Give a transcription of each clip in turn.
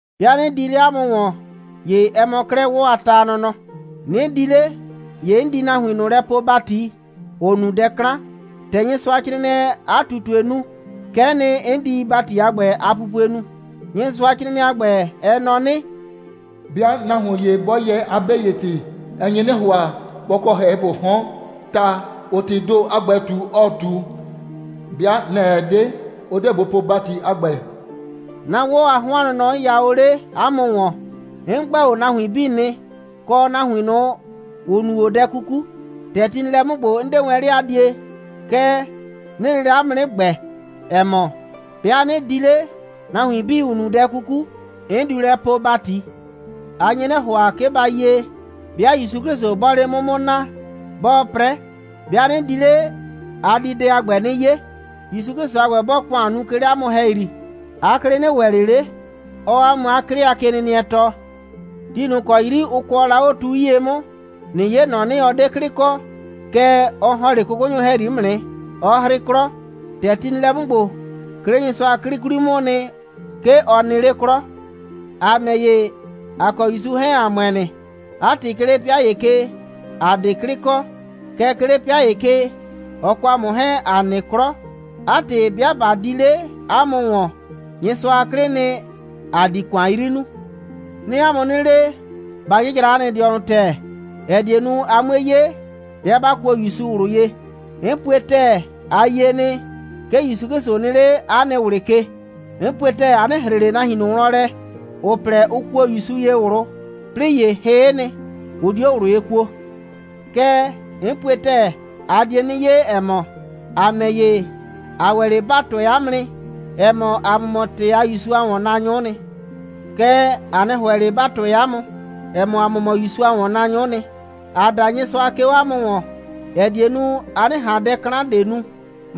'Bɩa 'nɩ di 'le 'a mʋ ‑wɔn, ‑ye ɛ mɔ 'klɛɛ 'wɔ a ta a nɔnɔ. 'Nɩ di 'le, ‑ye 'n di nahuin ꞊nʋ lɛ poo ‑bati, ‑ʋ nu dɛ 'klan. ‑Tɛ Nyɩsʋacrɩɩnɩɛɛ 'a ꞊tutue nu, kɛ'ɛ nɩ, 'n di ‑bati a ‑gbɛ a pupue nu. Nyɩsʋacrɩɩnɩɛ a ‑gbɛ, ɛ nɔ 'nɩ: «'Bɩa nahuon ‑ye 'bɔ yɛɛ 'a 'be ‑ye ‑tɩ, ɛ nye 'nɩ ‑hʋa, bɔ kɔ ‑hɛhɩpʋʋ 'hɔn, ta, ‑ʋʋ ‑tɩɩ ‑do a ‑gbɛ ꞊tu, ɔɔ ꞊tu. 'Bɩa nɛ‑ ɛ 'de, ʋ 'deɛ bʋ po ‑bati a ‑gbɛ.» 'Na 'wɔ a 'hɔn a nɔnɔ, 'n ya o 'le 'a mʋ ‑wɔn, 'n ‑gbɛ o nahuin 'bii nɩ, kɔ nahuin ꞊nʋ, ‑ʋ nu o dɛ 'kuku. ‑Tɛ ti nɩ lɛ 'mʋ ‑gbo, 'n 'de wɛn 'le a die, kɛɛ, 'nɩɩ lele 'a mʋ 'nɩ ‑gbɛ, ‑ɛ mɔ, 'bɩa 'nɩ di 'le, nahuin 'bii, ‑ʋ nu dɛ 'kuku, 'n diu lɛ poo ‑bati. A nye 'nɩ ‑hʋa, 'ke ba yie, 'bɩa ‑Yusu 'Klɩsʋ 'bɔɔ 'le 'mʋ 'mʋ naa, 'bɔɔ 'prɛ. 'Bɩa 'nɩ di 'le, a di dɛ a ‑gbɛ 'nɩ 'ye. ‑Yusu 'Klɩsʋ a ‑gbɛ, 'bɔɔ ‑kʋan nu, 'ke 'le 'a mʋ ‑hɛyri, 'a 'klɩ 'nɩ ‑wɛ ꞊le 'le, 'ɔɔ 'a mʋ 'a 'klɩ a kenɩnɩɛ tɔɔ. Ti ꞊nʋ ‑kɔ 'yri ʋ kʋɔ la 'o tu 'yie 'mʋ, ꞊nɩ 'ye ‑nɔ 'nɩ, ɔ 'de 'klɩ kɔ. Kɛɛ, ɔ ‑hɔn 'le 'kʋkʋnyʋ ‑hɛyri 'mʋ nɩ, 'ɔ 'hrɩ 'klɔ. ‑Tɛ ti nɩ lɛ 'mʋ ‑gbo, 'ke 'le Nyɩsʋa a 'klɩ 'kwli 'mʋʋ nɩ, 'ke ɔ nɩ 'le 'klɔ. ‑A ‑mɛ ‑ye, ‑a kɔ ‑Yusu 'hɛɛn, ‑a ‑mʋɛ nɩ. 'A ‑tɩ, 'ke 'le 'pɩa ‑ye ke, ‑a 'de 'klɩ kɔ. Kɛɛ, 'ke 'le 'pɩa ‑ye ke, ɔ kɔ ‑a mʋ 'hɛɛn, ‑a nɩ 'klɔ. 'A ‑tɩ, 'bɩa ꞊ba di 'le 'a mʋ ‑wɔn, Nyɩsʋa a 'klɩɩ nɩ, ‑a di ‑kʋan 'yri nuu. 'Nɩɩ 'a mʋ 'nɩ le, ba 'jɩjra 'a nɩ dɩɔnʋ ‑tɛɛ, ‑ɛ die nu, a 'mue 'ye, 'bɩa 'ba kuo ‑Yusu ꞊wlʋ ye. 'N pue ‑tɛɛ, a yie nɩ, 'ke ‑Yusu 'Klɩsʋ nɩ 'le 'a nɩ ꞊wlɩ ke. 'N pue ‑tɛɛ, a 'nɩ ‑hre ꞊le nahuin ꞊nʋ wlɔn lɛ, ‑ʋ plɛ, ʋ kuo ‑Yusu ye ꞊wlʋ, 'plɩɩ ‑ye hɩ'ɩ nɩ, ʋ 'dio ꞊wlʋ ye kuo. Kɛɛ, 'n pue ‑tɛɛ, a die 'nɩ 'ye, ‑ɛ mɔ, ‑a ‑mɛ ‑ye, ‑a ‑wɛ 'le ‑ba tʋɛ 'a mʋ nɩ, ‑ɛ mɔ, ‑a mʋ mɔ ‑tɛɛ a ‑Yusu a ‑wɔnnaanyʋ'ʋ nɩ. Kɛɛ, ‑a 'nɩ ‑hʋɛ ꞊le, ‑ba tʋɛ 'a mʋ, ‑ɛ mɔ, ‑a mʋ mɔ ‑Yusu a ‑wɔnnaanyʋ'ʋ nɩ. ‑Aa da Nyɩsʋa, 'ke 'o 'a mʋ ‑wɔn, ‑ɛ die nu, a 'nɩ ꞊han dɛ 'klan ꞊de nu.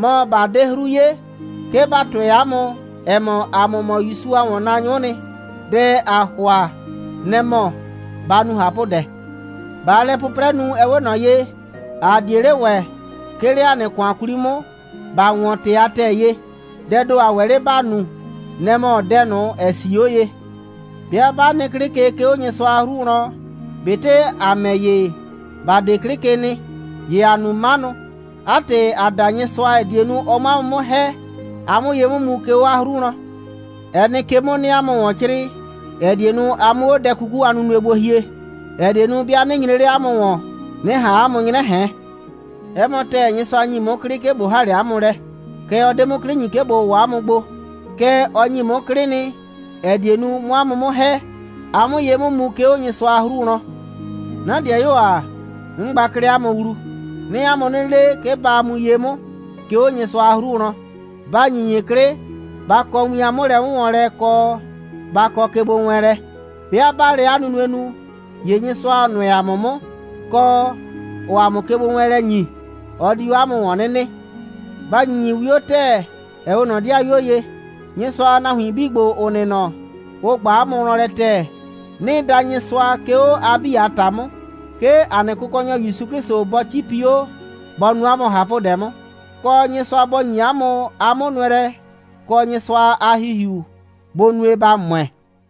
Mɔ, ꞊ba 'de 'hru 'ye, 'ke ‑ba tʋɛ 'a mʋ, ‑ɛ mɔ, ‑a mʋ mɔ ‑Yusu a ‑wɔnnaanyʋ'ʋ nɩ, dɛ ‑aa ‑hʋa, nɛ‑ mɔ, ba nu ꞊hapʋdɛ. ꞊Baa lɛ 'pʋprɛ nu, ɛ 'we ꞊nɔ ye, ‑a 'die 'le ‑wɛ, 'ke 'le ‑a nɩ ‑kʋan 'kwli 'mʋ, ‑ba ‑wɔn ‑tɩ a ‑tɛɛ ye. Dɛɛ ‑do ‑a ‑wɛ 'le ‑ba nu, nɛ‑ mɔ dɛ ꞊nʋ, ‑ɛ 'sii 'o ye. 'Bɩa 'ba nɩ 'klɩ ke, 'ke 'o Nyɩsʋa a 'hru wlɔn, ꞊betɩ ‑a ‑mɛ ‑ye, ‑ba 'de 'klɩ ke nɩ, ‑ye ‑aa nu 'manʋ. 'A ‑tɩ, ‑aa da Nyɩsʋa, ‑ɛ die nu, ɔ 'mʋ 'a mʋ 'mʋ ‑hɛ, a 'mʋ ye 'mʋ mu, 'ke 'o 'a 'hru wlɔn. Ɛ nɩ ke 'mʋ, 'nɩɩ 'a mʋ ‑wɔn 'crɩɩ, ‑ɛ die nu, a 'mʋ 'o dɛ 'kuku a nunue gbo hie, ‑ɛ die nu, 'bɩa 'nɩ nyre 'le 'a mʋ ‑wɔn, 'nɩ ꞊han 'a mʋ 'nyrɛ ꞊hɛn. 'Ɛ mɔ ‑tɛɛ, Nyɩsʋa ‑nyi 'mʋ 'klɩ, 'ke ꞊bo ‑ha 'le 'a mʋ lɛ. Kɛɛ, ɔ 'de 'mʋ 'klɩ ‑nyi, 'ke ꞊bo ‑wɔ 'a mʋ gbo. Kɛɛ, ɔ ‑nyi 'mʋ 'klɩ nɩ, ‑ɛ die nu, 'mʋ 'a mʋ 'mʋ ‑hɛ, a 'mʋ ye 'mʋ mu, 'ke 'o Nyɩsʋa a 'hru wlɔn. 'Na 'dɩayuo ‑a. 'N gba 'klɛɛ 'a mʋ wlu. 'Nɩɩ 'a mʋ 'nɩ le, 'ke ba mu ye 'mʋ, 'ke 'o Nyɩsʋa a 'hru wlɔn. Ba ‑nyinyi 'klɩ. Ba kɔ win a 'mʋlɛ'wʋnwɔnlɛ, kɔ, ba kɔ kegbowɛɛnlɛ. 'Bɩa 'baa lɛ 'a nunue nu, ‑ye Nyɩsʋa, ‑ɔ nʋɛ ‑a mʋ 'mʋ, kɔ, ‑ɔɔ ‑a mʋ kegbowɛɛnlɛ ‑nyi, ɔ di 'o 'a mʋ ‑wɔn 'nɩ nɩ. Ba ‑nyinyi 'wio ‑tɛɛ, ‑ɛ 'we ꞊nɔ 'dɩayuo ye. Nyɩsʋa a nahuin 'bii ‑gbo, ‑ʋ nɩ nɔ, ʋ ꞊gba 'a mʋ wlɔn lɛ ‑tɛɛ. 'Nɩɩ da Nyɩsʋa, 'ke 'o a 'bii a ‑ta 'mʋ, 'ke ‑a nɩ Kʋkɔnyɔ ‑Yusu 'Klɩsʋ bɔ 'cipi 'o, bɔ nu 'a mʋ ꞊hapʋdɛ 'mʋ, kɔ, Nyɩsʋa bɔ ‑nyi 'a mʋ 'a 'mʋnʋɛlɛ, kɔ, Nyɩsʋa a ‑Hihiu bʋ nue, ba ‑mʋɛ.